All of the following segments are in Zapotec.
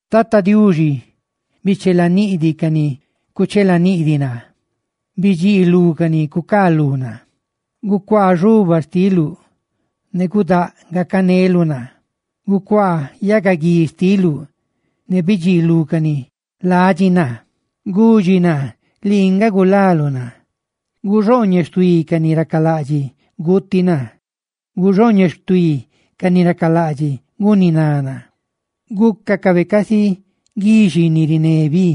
Tata Diuxi, bichelaniꞌdiꞌ ca ni cuchelaniꞌdiꞌ naa; bidxiilú ca ni cucaalú naa. Gucuaa xobaa xtiluꞌ ne gudáꞌ gacaneluꞌ naa; gucuaa yagaguíb xtiluꞌ ne bidxiilú ca ni ladxi naa; ¡gudxi naa lii nga gulaluꞌ naa! Guxooñeꞌ xtuí ca ni racalaꞌdxiꞌ guuti naa; guxooñeꞌ xtuí ca ni racalaꞌdxiꞌ guniná naa; ¡gúcacabe casi guixi ni riné bi,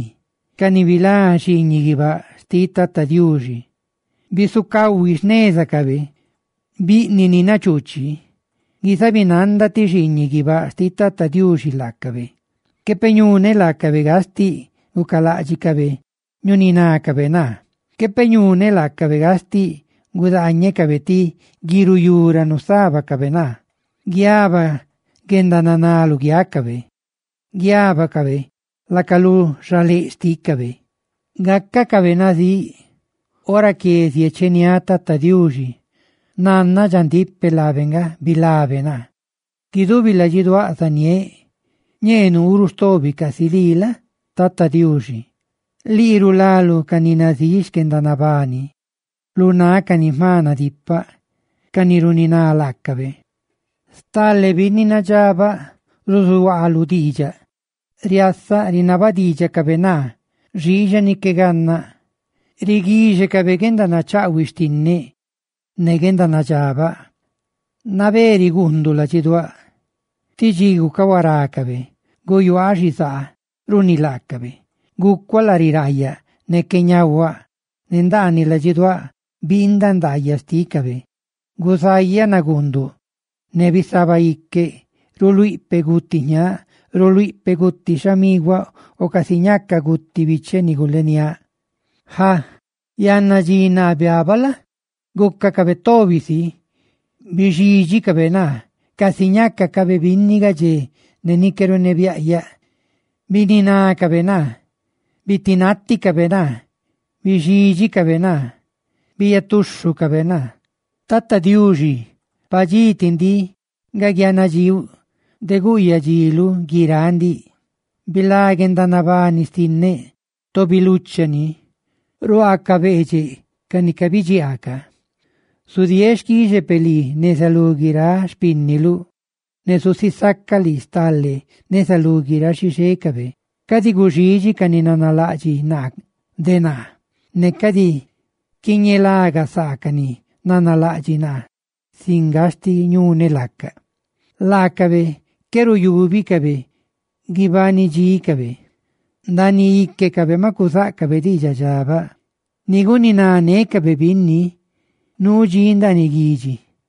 ca ni biree nanda xiiñiꞌ guibáꞌ xtiꞌ Tata Diuxi! ¡Bisucahui xnézacabe, biꞌniꞌ ni nachuuchi, guizabinanda ti xiiñiꞌ guibáꞌ xtiꞌ Tata Diuxi laacabe! Quepeꞌ ñuneꞌ laacabe gastiꞌ gucaláꞌdxicabe ñuninácabe naa; quepeꞌ ñuneꞌ laacabe gastiꞌ gudaañecabe ti guiruyú ra nusábacabe naa. ¡Guiaba guendananá luguiácabe! ¡Guiábacabe laca lu xaléꞌ xtícabe! ¡Gácacabe nazíꞌ! Ora que ziecheniáꞌ Tata Diuxi, nannaꞌ dxandíꞌ peꞌ laabe nga bilabe naa. Guidubi ladxiduáꞌ zaniéꞌ: «Ñee nuu ruꞌ stobi casi lii la? Tata Diuxi, Lii rulaluꞌ ca ni nazíꞌ xquendanabani, lu náꞌ ca ni jma nadipaꞌ, cani runiná laacabe.» Riasa stale binni nadxabaꞌ ruzuhuaa lu xtiidxaꞌ, ne rinaba diidxacabe naa xiixa ni qué gannaꞌ. Riguíxecabe guendanachaꞌhuiꞌ xtinneꞌ ne guendanadxabaꞌ, nabé riguunduꞌ ladxiduáꞌ; tí dxi gucahuarácabe, guyuaaꞌ xizaa runi laacabe, gucuaꞌ lari raayaꞌ ne qué ñahuaꞌ, ne ndaaniꞌ ladxiduáꞌ biindaꞌ ndaayaꞌ xtícabe. Guzayaꞌ naguunduꞌ ne bisabaꞌ iqueꞌ, ruluíꞌ peꞌ guti jñaaꞌ, ruluíꞌ peꞌ guti xhamiguaꞌ o casi ñaca guti bicheꞌ ni guleniáꞌ. Ja, yanna dxi naa biabaꞌ la? gúcacabe tobi si, bixídxicabe naa; casi ñácacabe binni gadxé ne ni qué runebiaꞌyaꞌ, bininácabe naa. Bitinaticabe naa, bixídxicabe naa, biiyatuxhucabe naa. Tata Diuxi, padxí ti ndiꞌ nga guianadxiuꞌ de guyadxiluꞌ guiráꞌ ndiꞌ. ¡Bilá guendanabani xtinneꞌ, tobi lucha ni, lu ruaa ca beedxeꞌ ca ni cabidxiaa ca! Zudieeꞌ xquixe peꞌ lii neza lú guiráꞌ xpínniluꞌ; ¡ne zusisaca lii stale neza lú guiráꞌ xixécabe! Cadi guxidxi ca ni nanalaꞌdxiꞌ naa de naa; ne cadi quiñelagasaacaꞌ, ca ni nanalaꞌdxiꞌ naa sin gastiꞌ ñuneꞌ laaca. Laacabe qué ruyúbicabe guibanidxícabe, ndaaniꞌ íquecabe maꞌ cuzáꞌcabe diidxaꞌ dxabaꞌ, ni guninanécabe binni nuu dxí ndaaniꞌ guidxi;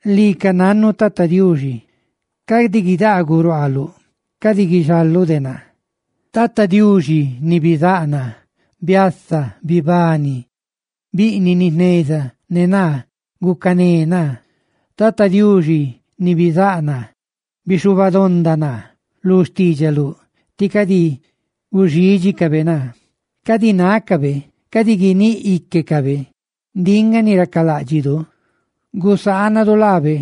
¡Lii ca nannuꞌ, Tata Diuxi! ¡Cadi guidaaguꞌ ruaaluꞌ! ¡Cadi guixaluꞌ de naa! Tata Diuxi ni bizáꞌ naa, biasa, ¡bibani! Biꞌniꞌ ni jneza ne naa, gucané naa. Tata Diuxi ni bizáꞌ naa, bixhubadonda naa, lu xtiidxaluꞌ. ¡Tí cadi guxídxicabe naa! Cadi nácabe, cadi guiníꞌ íquecabe: «¡Ndiꞌ nga ni racaláꞌdxidu! ¡Gusaanadu laabe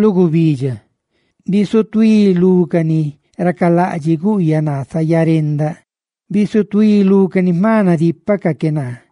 lu gubidxa!» Bisutuí lú ca ni racalaꞌdxiꞌ guꞌyaꞌ naa zayarendaꞌ; bisutuí lú ca ni ná jma nadípacaꞌ que naa.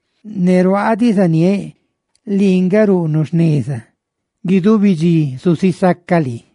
Ne ruaaꞌ diꞌ zaniéꞌ lii nga ruꞌnuꞌ jneza; ¡guidubi dxi zusisacaꞌ lii!